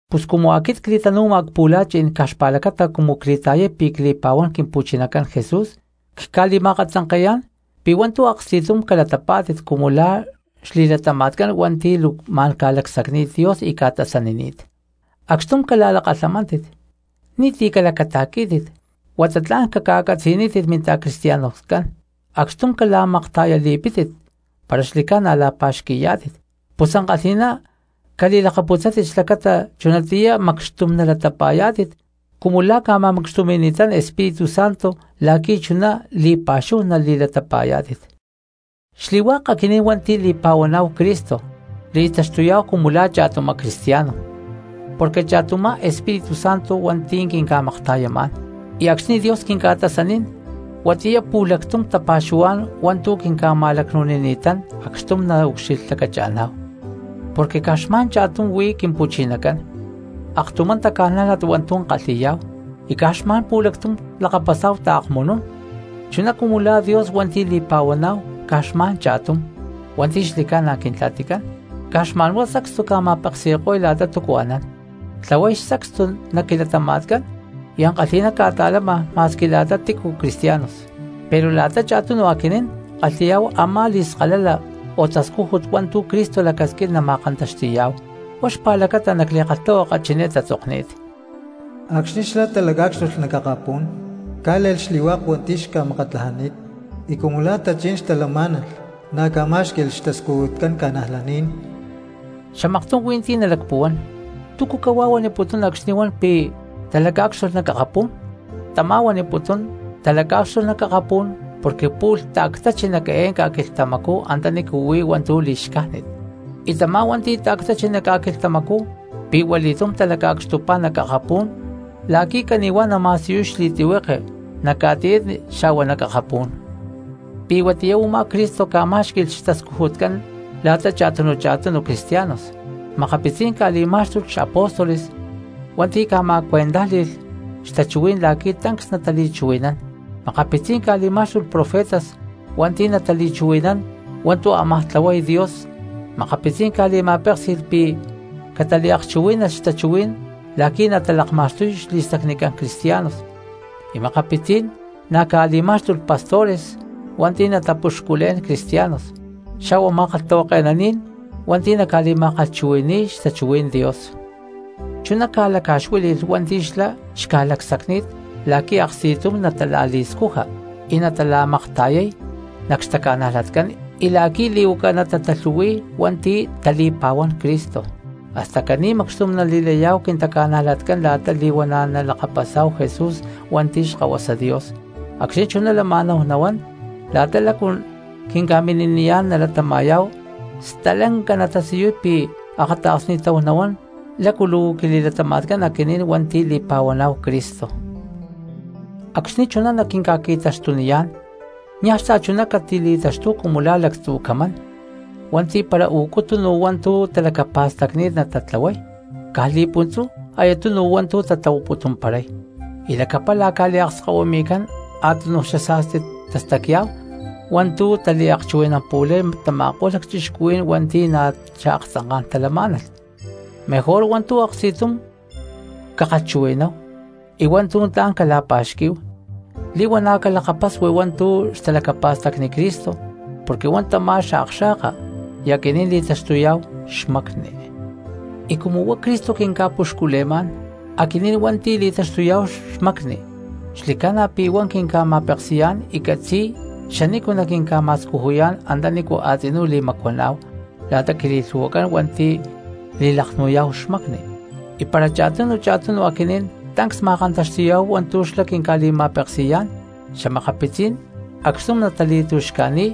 Pus cumu aquit cli̠tanu̠ma cpu̠la̠chí̠n caj xpa̠lacata cumu cli̠ta̠yay pi̠ cli̠pa̠huán Quimpu̠chinacán Jesús, cca̠li̠ma̠akatzanke̠yá̠n pi̠ hua̠ntu̠ aksti̠tum calatapá̠tit cumu la̠ xli̠latama̠tcán hua̠nti̠ luu ma̠n ca̠lacsacni̠t Dios y ca̠tasanini̠t. Acxtum cala̠lakalhamántit, ni̠ti̠ calacata̠quí̠tit huata tla̠n caca̠catzi̠nítit minta̠cristianoscán, acxtum cala̠makta̠yali̠pítit para xli̠ca̠na la̠pa̠xqui̠yá̠tit. Pus ankalhi̠ná cali̠lakaputzátit xlacata chunatiyá macxtum nalayá̠tit cumu la̠ ca̠ma̠macxtumi̠ni̠tán Espíritu Santo la̠qui̠ chuná li̠pa̠xúhu nali̠latapa̠yá̠tit. Xli̠hua̠k aquinín hua̠nti̠ li̠pa̠huaná̠hu Cristo li̠taxtuyá̠hu cumu la̠ cha̠tumá cristiano porque cha̠tumá Espíritu Santo hua̠nti̠ quinca̠makta̠yamá̠n, y acxni̠ Dios quinca̠tasanín huatiyá pu̠lactum tapa̠xuhuá̠n hua̠ntu̠ quinca̠ma̠lacnu̠nini̠tán acxtum naucxilhlacacha̠ná̠hu. Porque caj xma̠n cha̠tum huí Quimpu̠chinacán, aktumá taca̠nájlat hua̠ntu̠ kalhi̠yá̠hu y caj xma̠n pu̠lactum lakapasá̠hu taakmunú̠n. Chuná cumu la̠ Dios hua̠nti̠ li̠pa̠huaná̠hu caj xma̠n cha̠tum hua̠nti̠ xli̠ca̠na Quintla̠ticán, caj xma̠nhuá sacstu ca̠ma̠peksi̠ko̠y la̠ta túcu anán, tlahuay xtascújut nac quilatama̠tcán y ankalhi̠ná ca̠ta̠lama ma̠squi la̠ta tícu cristianos. Pero la̠ta cha̠tunu aquinín kalhi̠yá̠hu a̠má li̠skalala o tascújut hua̠ntu̠ Cristo lacasquín nama̠kantaxti̠yá̠hu. Huá xpa̠lacata nac li̠kalhtahuaka chiné tatzokni̠t: Acxni̠ xlá talacá̠cxtulh nac akapú̠n cá̠le̠lh xli̠hua̠k hua̠nti̠ xca̠makatlajani̠t y cumu la̠ tachí̠n xtalamá̠nalh, na̠ ca̠má̠xqui̠lh xtascujutcán cristianos. Xamaktum hui̠ntí nalacpuhuán: “¿Túcu cahuá huaniputún acxni̠ huan pi̠ talacá̠cxtulh nac akapú̠n?” Tamá huaniputún talacá̠cxtulh nac akapú̠n porque pu̠lh ta̠ctáchi nac eé ca̠quilhtamacú antanícu huí hua̠ntu̠ li̠xcájnit. Y tamá hua̠nti̠ ta̠ctáchi nac ca̠quilhtamacú pi̠huali̠túm talaca̠cxtupá nac akapú̠n la̠qui̠ cani̠huá nama̠siyuy xli̠tlihueke nac ca̠tiyatni xa̠hua nac akapú̠n. Pi̠ huatiyá u̠má Cristo ca̠má̠xqui̠lh xtascujutcán la̠ta cha̠tunu cha̠tunu cristianos. Makapitzí̠n ca̠li̠má̠xtulh xapóstoles hua̠nti̠ ca̠ma̠cuentájli̠lh xtachuhuí̠n la̠qui̠ tancs natali̠chuhui̠nán, makapitzí̠n ca̠li̠má̠xtulh profetas hua̠nti̠ natali̠chuhui̠nán hua̠ntu̠ ámaj tlahuay Dios, makapitzí̠n ca̠li̠ma̠péksi̠lh pi̠ cataliakchuhuí̠nalh xtachuhuí̠n la̠qui̠ natalakma̠xtuy xli̠stacnicán cristianos, y makapitzí̠n na̠ ca̠li̠má̠xtulh pastores hua̠nti̠ natapuxculé̠n cristianos, xa̠hua ma̠kalhtahuake̠naní̠n hua̠nti̠ naca̠li̠ma̠kalhchuhui̠ni̠y xtachuhuí̠n Dios. Chuná ca̠laca̠xuíli̠lh hua̠nti̠ xlá xca̠lacsacni̠t la̠qui̠ aksti̠tum natala̠li̠scuja y natala̠makta̠yay nac xtaca̠najlatcán y la̠qui̠ li̠huaca natatalhu̠hui̠y hua̠nti̠ tali̠pa̠huán Cristo, hasta caní macxtum nali̠layá̠hu quintaca̠najlatcán la̠ta li̠huana̠ nalakapasá̠hu Jesús hua̠nti̠ Xkahuasa Dios. Acxni̠ chuná lama̠náhu nahuán la̠ta lácu quinca̠mini̠niyá̠n nalatama̠yá̠hu, stalanca natasiyuy pi̠ akata̠ksni̠táhu nahuán lácu luu quili̠latama̠tcán aquinín hua̠nti̠ li̠pa̠huaná̠hu Cristo. Acxni̠ chuná naquinca̠qui̠taxtuniyá̠n niaj xta̠chuná catili̠taxtúhu cumu la̠ lactzu̠ camán hua̠nti̠ para u̠cu tunu hua̠ntu̠ talacapa̠stacni̠t natatlahuay, caj li̠puntzú aya tunu hua̠ntu̠ tatlahuaputumparay, y lacapala ca̠liakskahuimi̠cán a̠túnuj xasa̠sti tastacya̠hu hua̠ntu̠ taliakchuhui̠nampu̠lay tama̠ko̠lh lacchixcuhuí̠n hua̠nti̠ na̠ xaaktzanká̠n talamá̠nalh. Mejor hua̠ntu̠ aksti̠tum cakalhchuhui̠náhu y hua̠ntu̠ tla̠n cala̠pa̠xquí̠hu, li̠huana̠ calakapasui hua̠ntu̠ xtalacapa̠stacni Cristo, porque huá tamá xakxa̠ka y aquinín li̠taxtuyá̠hu xmacni. Y cumu huá Cristo quinca̠puxcule̠má̠n, aquinín hua̠nti̠ li̠taxtuyá̠hu xmacni xli̠ca̠na pi̠ huá quinca̠ma̠peksi̠yá̠n y catzi̠y xanícu naquinca̠ma̠scujuyá̠n antanícu a̠tzinú li̠macuaná̠hu la̠ta quili̠lhu̠huacán hua̠nti̠ li̠laknu̠yá̠hu xmacni. Y para cha̠tunu cha̠tunu aquinín tancs ma̠kantaxti̠yá̠hu hua̠ntu̠ xlá quinca̠li̠ma̠peksi̠yá̠n, xa̠makapitzí̠n acxtum natali̠tu̠xca̠ni̠y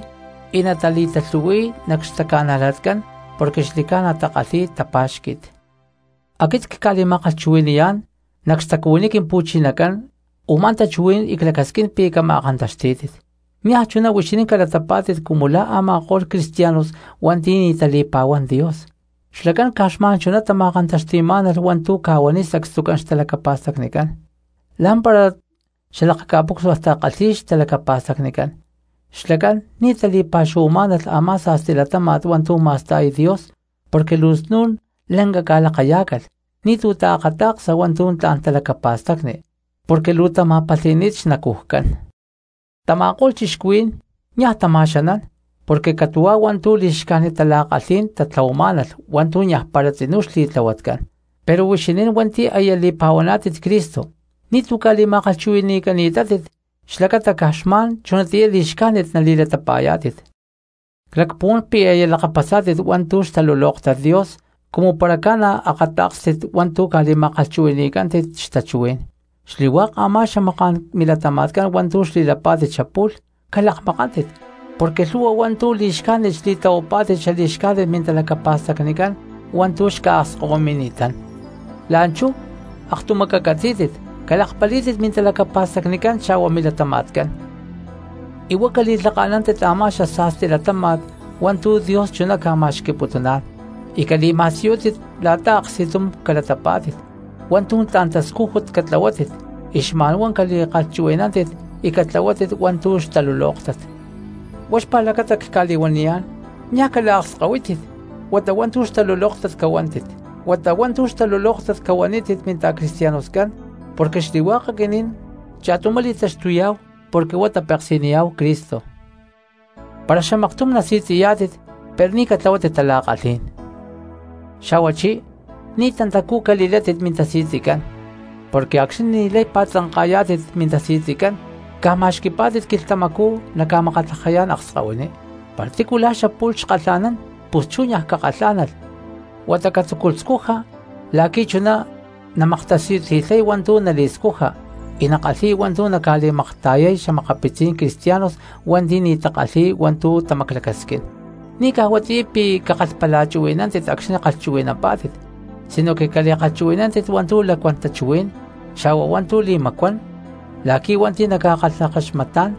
y natali̠talhu̠hui̠y nac xtaca̠najlatcán porque xli̠ca̠na takalhi̠y tapa̠xqui̠t. Aquit cca̠li̠ma̠kalhchuhui̠ni̠yá̠n nac xtacuhuiní Quimpu̠chinacán u̠má tachuhuí̠n y clacasquín pi̠ cama̠kantaxtí̠tit: niaj chuná huixinín calatapá̠tit cumu la̠ a̠ma̠ko̠lh cristianos hua̠nti̠ ní tali̠pa̠huán Dios, xlacán caj xma̠n chuná tama̠kantaxti̠má̠nalh hua̠ntu̠ ca̠huaniy sacstucán xtalacapa̠stacnicán, lá̠mpara xalakaca̠pucsua takalhi̠y xtalacapa̠stacnicán. Xlacán ni̠ tali̠pa̠xuhuamá̠nalh a̠má sa̠sti latáma̠t hua̠ntu̠ ma̠sta̠y Dios porque luu snu̠n lanca ca̠lakayá̠calh ni̠tu̠ taakata̠ksa hua̠ntu̠ tla̠n talacapa̠stacni porque luu tama̠palhi̠ni̠t xnacujcán. Tama̠ko̠lh cristianos niaj tama̠xanán porque catu̠huá hua̠ntu̠ li̠xcájnit tala̠kalhí̠n tatlahuamá̠nalh hua̠ntu̠ niaj para tzinú xli̠tlahuatcán. Pero huixinín hua̠nti̠ aya li̠pa̠huaná̠tit Cristo ni̠tu̠ ca̠li̠ma̠kalhchuhui̠ni̠cani̠tátit xlacata caj xma̠n chunatiyá li̠xcájnit nali̠latapa̠yá̠tit. Clacpuhuán pi̠ aya lakapasá̠tit hua̠ntu̠ xtalulóktat Dios cumu para ca̠na akatá̠kstit hua̠ntu̠ ca̠li̠ma̠kalhchuhui̠ni̠cántit xtachuhuí̠n. Xli̠hua̠k a̠má xamaká̠n milatama̠tcán hua̠ntu̠ xli̠lapá̠tit xapu̠lh calakmakántit porque lhu̠hua hua̠ntu̠ li̠xcájnit xli̠tlahuapá̠tit xali̠xcájnit mintalacapa̠stacnicán hua̠ntu̠ xca̠akskahuimi̠ni̠tán. La̠nchú aktumá cacatzí̠tit calakpalí̠tit mintalacapa̠stacnicán xa̠hua milatama̠tcán, y huá cali̠lhaka̠nántit a̠má xasa̠sti latáma̠t hua̠ntu̠ Dios chuná ca̠ma̠xqui̠putuná̠n, y cali̠ma̠siyútit la̠ta aksti̠tum calatapá̠tit. Hua̠ntu̠ tla̠n tascújut catlahuátit y xma̠nhuá cali̠kalhchuhui̠nántit y catlahuátit hua̠ntu̠ xtalulóktat. Huá xpa̠lacata cca̠li̠huaniyá̠n niaj cala̠akskahuítit huata hua̠ntu̠ xtalulóktat cahuanítit minta̠cristianoscán, porque xli̠hua̠k aquinín cha̠tumá li̠taxtuyá̠hu porque huá tapeksi̠niyá̠hu Cristo. Para xamaktum nasi̠tzi̠yá̠tit pero ni̠ catlahuátit tala̠kalhí̠n, xa̠huachí ni̠ tantacú cali̠látit mintasi̠tzicán. Porque acxni̠ ni̠lay pa̠tzanka̠yá̠tit mintasi̠tzi caj ma̠xqui̠pá̠tit quilhtamacú naca̠makatlajayá̠n akskahuiní. Para tícu la̠ xapu̠lh xkalha̠nán pus chú niaj cakalhá̠nalh huata catzúculh scuja la̠qui̠ chuná namaktasiyuti̠lhay hua̠ntu̠ nali̠scuja y nakalhi̠y hua̠ntu̠ naca̠li̠makta̠yay xa̠makapitzí̠n cristianos hua̠nti̠ ni̠ takalhi̠y hua̠ntu̠ tamaclacasquín. Ni̠ caj huatiyá pi̠ cakalhapalachuhui̠nántit acxni̠ kalhchuhui̠nampá̠tit sino cali̠kalhchuhui̠nántit hua̠ntu̠ lacuán tachuhuí̠n xa̠hua hua̠ntu̠ li̠macuán la̠qui̠ hua̠nti̠ naca̠kalhakaxmatá̠n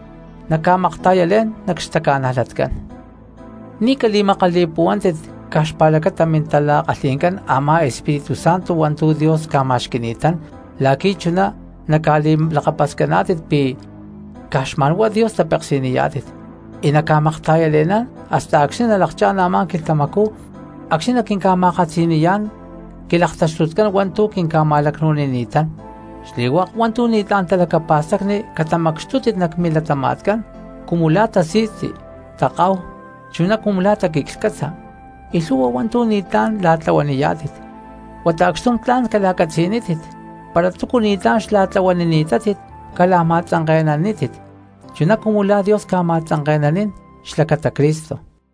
naca̠makta̠yalé̠n nac xtaca̠najlatcán. Ni̠ cali̠makali̠puhuántit caj xpa̠lacata mintala̠kalhi̠ncán a̠má Espíritu Santo hua̠ntu̠ Dios ca̠ma̠xqui̠ni̠tán la̠qui̠ chuná naca̠li̠lakapascaná̠tit pi̠ caj xma̠nhuá Dios tapeksi̠niyá̠tit y naca̠makta̠yale̠ná̠n hasta acxni̠ nalakchá̠n a̠má quilhtamacú acxni̠ naquinca̠ma̠katzi̠niyá̠n quilaktaxtutcán hua̠ntu̠ quinca̠ma̠lacnu̠nini̠tán. Xli̠hua̠k hua̠ntu̠ ni̠tlá̠n talacapa̠stacni catamacxtútit nac milatama̠tcán, cumu la̠ tasi̠tzi, takahu, chuná cumu la̠ taquiclhcátza, y lhu̠hua hua̠ntu̠ ni̠tlá̠n la̠tlahuaniyá̠tit, huata acxtum tla̠n cala̠catzi̠nítit; para túcu ni̠tlá̠n xla̠tlahuanini̠tátit cala̠ma̠tzanke̠nanítit chuná cumu la̠ Dios ca̠ma̠tzanke̠nanín xlacata Cristo.